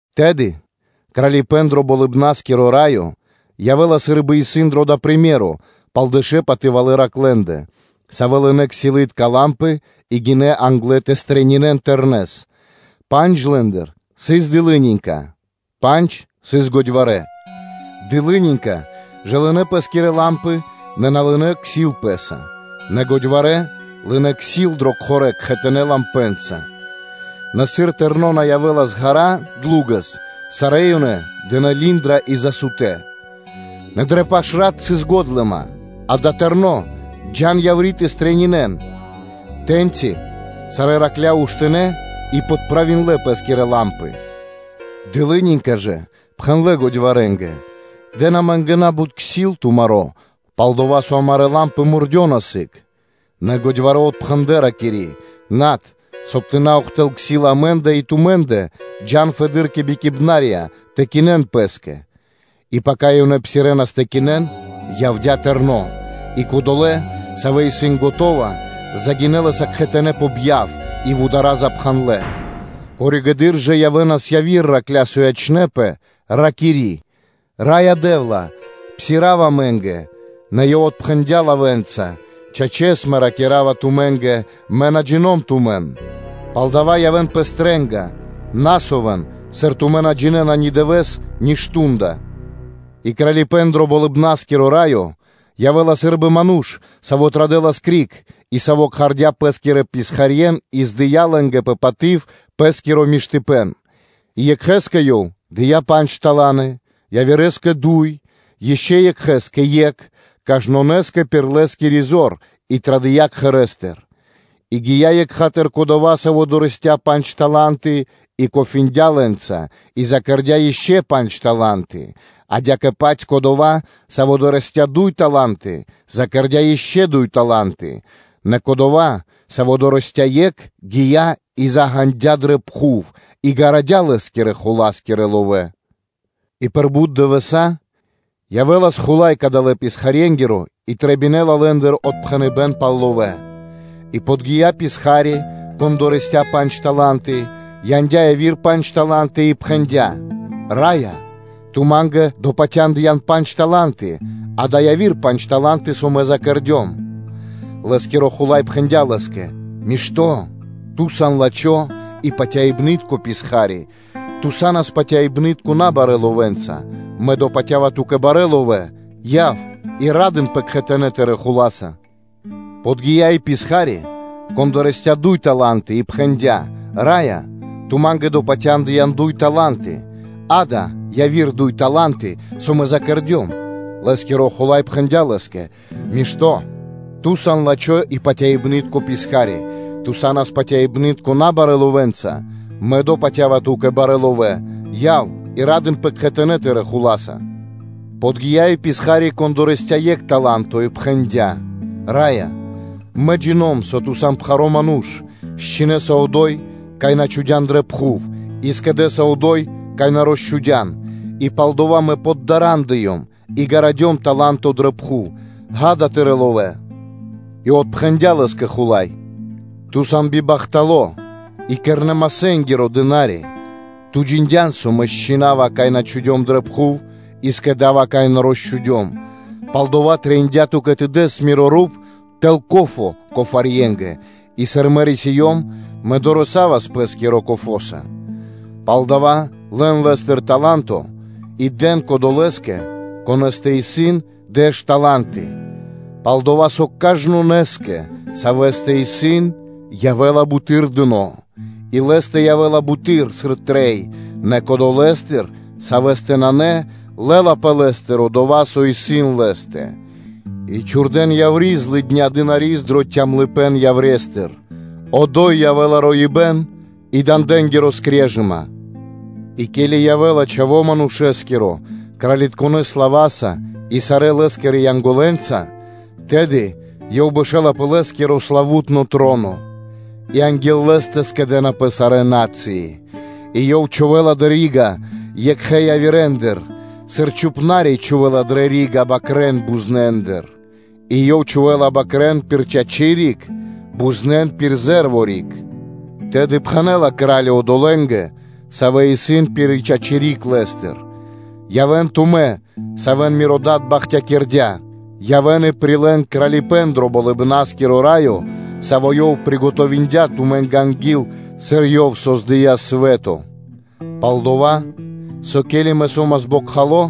Тэды Кралипэ́н дро Болыбна́скиро Раё явэ́ла сы́рбы дэш патывалэ́ тэрнэ́ джувля́, савэ́ лынэ́ ксилытка лампы и гинэ́ англэ тэ стрэнинэн (тэ пирилэн) Тэрнэс. Пандж лэ́ндыр сыс годьварэ́, пандж сыс дылынинька. Дылынинька жа лынэ́ пэ́скирэ лампы, нэ на лынэ́ ксил пэ́са; Нэ годьварэ́ лынэ́ ксил дрэ кхорэ́ кхэтанэ́ лампэнца. Нэ сыр Тэрно́ на явэ́лас ґара́ (длу́гэс), сарэ́ ёнэ дынэ́ линдра (задреминдлэ) и засутнэ. Нэ дрэ паш рат сыс годлыма: ‘Ѓа́да, Тэрно́, джа́н яври́ тэ стрэнинэн!’ Тэ́ньци сарэ́ патывалэ́ джувля́ уштинэ и подправиндлэ пэ́скирэ лампы. Дылынинька ж пхэндлэ́ годьварэнгэ: ‘Дэн амэ́нгэ на́бут ксил тумаро́, пал-дова́ со амарэ́ лампы мурдёна сыг.’ Нэ годьварэ́ отпхэндлэ́, ракири́: ‘Над, соб (кай) тэ на ухтылэл (на́доси) ксил амэ́ндэ и тумэ́ндэ. Джа́н фэды́р кэ бикиибнарья тэ кинэн пэ́скэ!’ И пака ёнэ псирэнас тэ кинэн, явдя́ Тэрно́, и кодолэ́, савэ́ исын скэдынэ́, загинэ́ лэ́са кхэтанэ́ пэ бьяв; и вудара́ запхандлэпэ. Коригэды́р (позжэды́р) явэ́нас яви́р патывалэ́ джувля́, савэ́ ячнэ́пэ, ракири́: ‘Раё Дэ́вла! Псирав (отпхандэ) амэ́нгэ: нэ Ёв отпхэнэ́ла лавэ́нца: ‘Чачэс, Мэ ракира́ва тумэ́нгэ, Мэ на джино́м тумэн.’ Палдава́ явэ́н пэ стрэ́га, на совэн, сыр тумэ́ на джинэ́на ни дывэ́с, ни мардо́ (шту́нда).” И Кралипэ́н дро Болыбна́скиро Раё явэ́ла сы́рбы ману́ш, саво́ традэлас криг, и саво́ кхардя́ пэ́скирэ писхарье́н и здыя лэ́нгэ пэ паты́в пэ́скиро миштыпэ́н. И екхэ́скэ ёв дыя́ пандж тала́нты, явирэскэ дуй, ишчо (инкэ́) екхэ́скэ екх, кажнонэ́скэ пир лэ́скири зор, и традыя́ кхэрэ́стыр. И гия́ екха́тыр кодова́, саво́ дорэсця́ пандж тала́нты и кофариндя лэ́нца и закэрдя ишчо (инкэ́) пандж тала́нты. Адя́кэ-паць кодова́, саво́ дорэсця́ дуй тала́нты, закэрдя ишчо (инкэ́) дуй тала́нты. Нэ кодова́, саво́ дорэсця́ екх, гия́ и заґанадя дрэ пхув и гарадя лэ́скирэ хула́скирэ ловэ́. И пир бут дывэса́, явэ́лас хула́й кадалэ́ писхарьенгиро и трэбинэла лэ́ндыр отпхэныбэ́н пал ловэ́. И подги́я писха́ри, кон дорэсця́ пандж тала́нты, яндя́ яви́р пандж тала́нты, и пхэндя́: ‘Раё, ту ма́нгэ допатяндыян пандж тала́нты; акэ, яви́р пандж тала́нты, со мэ закэрдём!’ Лэ́скиро хула́й пхэндя́ лэ́скэ: ‘Мишто́, ту сан лачхо́ и патяибны́тко писха́ри, ту са́нас патяибны́тко набарэ́ ловэнца; мэ допатява ту́кэ барэ́ ловэ́; яв и ра́дынпэ кхэтанэ́ тырэ́ хула́са!’ Подги́я и писха́ри, кон дорэсця́ дуй тала́нты и пхэндя́: ‘Раё, ту ма́нгэ допатяндыян дуй тала́нты: акэ, яви́р дуй тала́нты, со мэ закэрдём. Лэ́скиро хула́й пхэндя́ лэ́скэ: “Мишто́, ту сан лачхо́ и патяибны́тко писха́ри, ту са́нас патяибны́тко набарэ́ ловэнца; мэ допатява ту́кэ барэ́ ловэ́: яв и ра́дынпэ кхэтанэ́ тырэ́ хула́са.” Подги́я и писха́ри, кон дорэсця́ екх таланто и пхэндя́: ‘Раё, мэ джина́в, со ту сан пхаро́ ману́ш: счхинэса одо́й, кай на чхудя́н дрэ пхув, и скэдэса одо́й, кай на росчхудян, и палдова́ мэ поддарандыём и гарадём таланто дрэ пхув; акэ, тырэ́ ловэ́.’ И отпхэндя́ лэ́скэ хула́й: ‘Ту сан бибахтало́ и кирнэ-масэ́нгиро писха́ри; ту джиндян, со мэ счхинава, кай на чхудём дрэ пхув, и скэда́ва, кай на росчхудём? Палдова́ трэиндя́ ту́кэ тэ дэс миро руп тэл ко́фо кофарьенгэ, и сыр мэ рисиём, мэ дорэсавас пэ́скиро кофоса. Палдава́ лэн лэ́стыр таланто и дэн кодолэ́скэ, конэ́стэ исын дэш тала́нты: пал-дова́ со кажнонэ́скэ, савэ́стэ исын, явэ́ла буты́р дыно́, и лэ́стэ явэ́ла буты́р, сыр трэй; нэ кодолэстыр, савэ́стэ нанэ, лэ́лапэ лэ́стыр дова́, со исын лэ́стэ. И чхурдэ́н яври́ злыдня писхари́с дро цямлыпэ́н яврестыр; одо́й явэ́ла роибэ́н и дандэнгири скрежыма’ И ке́ли явэ́ла Чхаво́ Манушэ́скиро кралитконэ слава́са и сарэ́ Лэ́скирэ Янголэнца, тэды Ёв бэшэ́ла пэ Лэ́скиро славу́тно троно; и анги́л Лэ́стэ скэдэ́напэ сарэ́ на́цыи, и Ёв чхувэ́ла дрэ рига́ екхэ явирэндыр, сыр чхупна́ри (пастухо) чхувэ́ла дрэ рига́ бакрэ́н бузнендыр, и Ёв чхувэ́ла бакрэ́н пир чачи́ риг, бузнен пир зэ́рво (ле́во) риг. Тэды пхэнэ́ла Кра́ли одолэ́нгэ, савэ́ исын пир чачи́ риг Лэ́стыр: ‘Явэ́н тумэ́, савэ́н Миро Дад бахтякирдя́, явэ́н и прилэ́н Кралипэ́н дро Болыбна́скиро Раё, саво́ Ёв скэдыя́ тумэ́нгэ анги́л, сыр Ёв создыя́ свэ́то. Пал-дова́ со, ке́ли Мэ со́мас бокхало,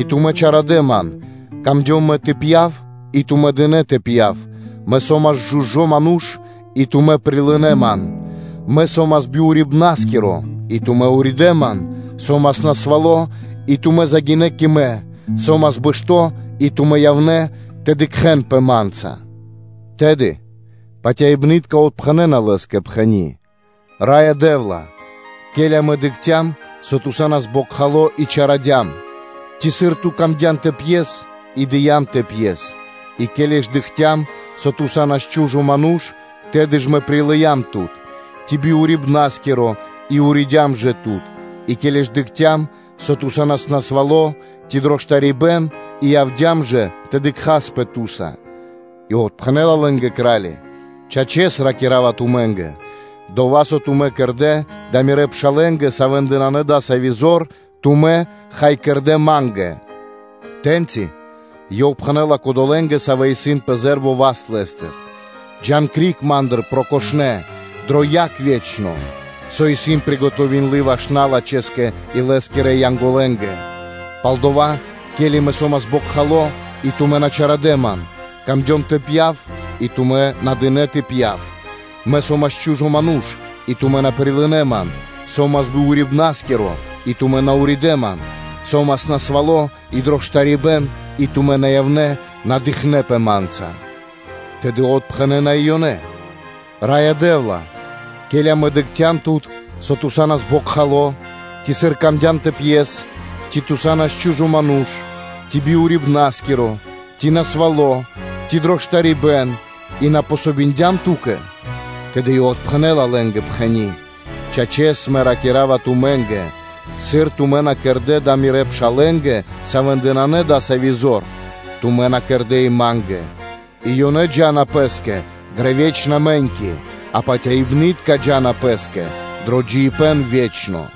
и тумэ́ чалякирдэ Ман; камдём тэ пья́в и тумэ́ дынэ́ тэ пья́в, Мэ со́мас чу́жо ману́ш, и тумэ́ прилынэ́ Ман, Мэ со́мас би урибнаскиро и тумэ́ уридэ́ Ман; со́мас насвало́ и тумэ́ загинэ́ кэ Мэ, со́мас бэшто́ и тумэ́ явнэ́ тэ дыкхэнпэ Ма́нца.’ Тэды патяибнытка отпхэнэна Лэ́скэ, пхэни́: ‘Раё Дэ́вла, ке́ли амэ дыкхцям, со Ту са́нас бокхало, и чарадям? Ци, сыр Ту́тэ сыс трэ́бима тэ пьес, и дыям тэ пьес? И ке́ли ж дыкхцям, со Ту са́нас чу́жо ману́ш, тэды ж прилыям тут? Ци би урибнаскиро, и уридям жэ Тут? И ке́ли ж дыкхцям, со Ту са́нас насвало́, ци дро штарибэ́н и явдя́м жэ тэ дыкхаспэ Ту́са?’ И отпхэнэ́ла лэ́нгэ Кра́ли: ‘Чачэс, ракира́ва тумэ́нгэ: ‘Дова́, со тумэ́ кэрдэ́ дава́ Мирэ́ пшалэ́нгэ, савэ́ндэ нанэ дасави́ зор, тумэ́, хай, кэрдэ́ Ма́нгэ.’ Тэ́ньци Ёв пхэнэ́ла кодолэ́нгэ, савэ́ исын пэ зэ́рво (ле́во) васт Лэ́стыр: ‘Джа́н криг Ма́ндыр, прокошнэ, дрэ яг ве́чно, со исын скэдыны ваш налачхэскэ и лэ́скирэ Янголэнгэ: пал-дова́, ке́ли Мэ со́мас бокхало, и тумэ́ на чарадэ Ман, трэбиндя ма́нгэ тэ пья́в, и тумэ́ на дынэ́ тэ пья́в; Мэ со́мас чу́жо ману́ш и тумэ́ на прилынэ́ Ман, Со́мас би урибнаскиро, и тумэ́ на уридэ́ Ман, Со́мас насвало́ и дро штарибэ́н и тумэ́ на явнэ́ тэ дыкхэнпэ Ма́нца.’ Тэды отпхэнэна и ёнэ: ‘Раё Дэ́вла, ке́ли амэ дыкхцям Тут, со Ту са́нас бокхало, ци сыр ту́тэ сыс трэ́бима тэ пьес, ци Ту са́нас чу́жо ману́ш, ци би урибнаскиро, ци насвало́ ци дро штарибэ́н и на дыям васт Ту́кэ?’ Тэды Ёв отпхэнэ́ла лэ́нгэ, пхэни́: ‘Чачэс, Мэ ракира́ва тумэ́нгэ: ‘Сыр тумэ́ на кэрдэ́ дава́ Мирэ́ пшалэ́нгэ, савэ́ндэ нанэ дасави́ зор, тумэ́ на кэрдэ́ и Ма́нгэ.’ И ёнэ джа́на пэ́скэ дрэ ве́чна мэ́ньки, а патяибнытка джа́на пэ́скэ дро джиибэ́н ве́чно.”